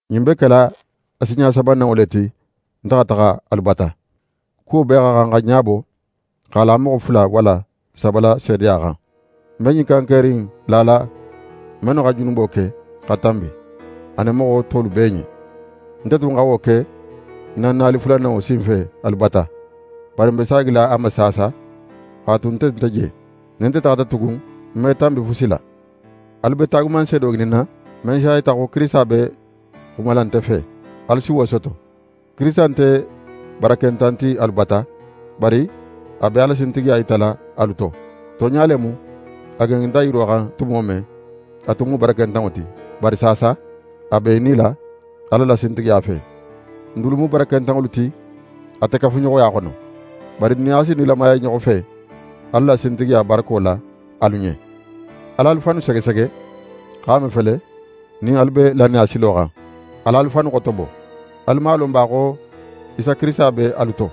Ɲin be kela a sinɲa sabananŋo le ti nte xa taxa alu bata. «Kuwo bee xa xan xa ɲabo x'a la moxo fula walla saba la seedeya xan.» Ń be ɲin kankeri in lala, mennu xa junubo ke xa tanbi anin moxo tolu bee ɲen. Nte tun xa wo ke ń na nali fulananŋo sinfe alu bata, bari ń be saagila a ma saasa x'a tu nte nte je: Nin nte taxata tugun, ń me tanbi fusi la. Alu be taagumanseedo ŋininna, men s'a yita xo Kirisita be xumala nte fe, alu si wo soto. Kirisita nte barakentan ti alu bata, bari a be a la sintigiya yitala alu to. Tonɲa le mu, a gengenta yiro xan tumo men, a tun mu barakentanŋo ti. Bari saasa, a be í nila Ala la sintigiya fe. N dulu mu barakentanŋolu ti ate kafuɲoxoya xono. Bari n nin a si nilamaya i ɲoxo fe, Ala la sintigiya barako la alu ɲen. Al'alu fannu segesege, x'a mafele nin alu be lannaya silo xan. Al'alu fannu xotobo. Alu man a lon ba xo Isa Kirisita be alu to?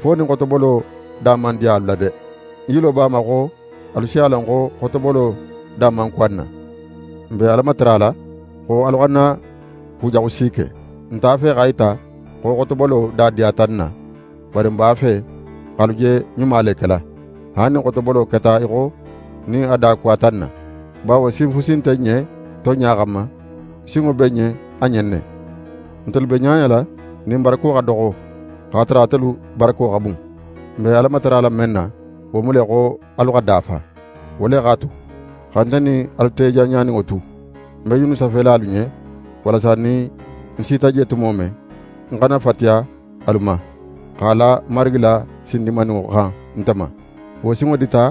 Fo nin xotobolo da man diya alu la de. Ń yilo b'a ma xo alu si a lon xo xotobolo da man kuwa n na. N be Ala matarala xo alu xana kujaxu si ke. N nte a fe x'a yita xo xotobolo da diyata n na, bari n b'a fe x'alu je ɲuma le kela, haali nin xotobolo keta í xo nin a da kuwata n na. Bawo sin fusi nte n ɲen tonɲa xanma, sinŋo be n ɲen a ɲen ne. Ntelu be ɲaɲala nin n barako xa doxo, x'a tara atelu barako xa bun. N be Ala matarala men na, wo mu le xo alu xa dafa. Wo le x'a tu, xa nte nin alu te janɲaninŋo tu, ń be ɲinnu safela alu ɲen, walasa nin nte sita je tumo men, nte xana fatiya alu ma x'a la Marigi la sin dinmaninŋo xan nte ma. Wo sinŋo dita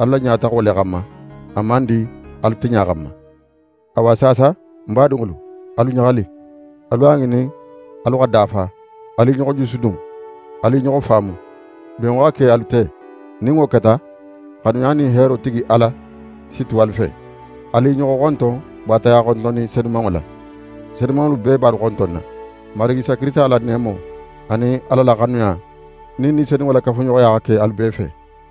alu la ɲataxo le xanma, a man di alu tiɲa xanma. Awa saasa, ń badinŋolu, alu ɲaxali, alu a ŋinin alu xa dafa, alu i ɲoxo jusudun. Alu i ɲoxo faamu. Benŋo xa ke alu te. Nin wo keta, xanuya nin heero tigi Ala si tu alu fe. Alu i ɲoxo xonton baataya xontonni senumanŋo la. Senumanŋolu bee be alu xontonna. Marigi Isa Kirisita la neemo, anin Ala la xanuya, nin Ni Senumanŋo la kafuɲoxoya xa ke alu bee fe.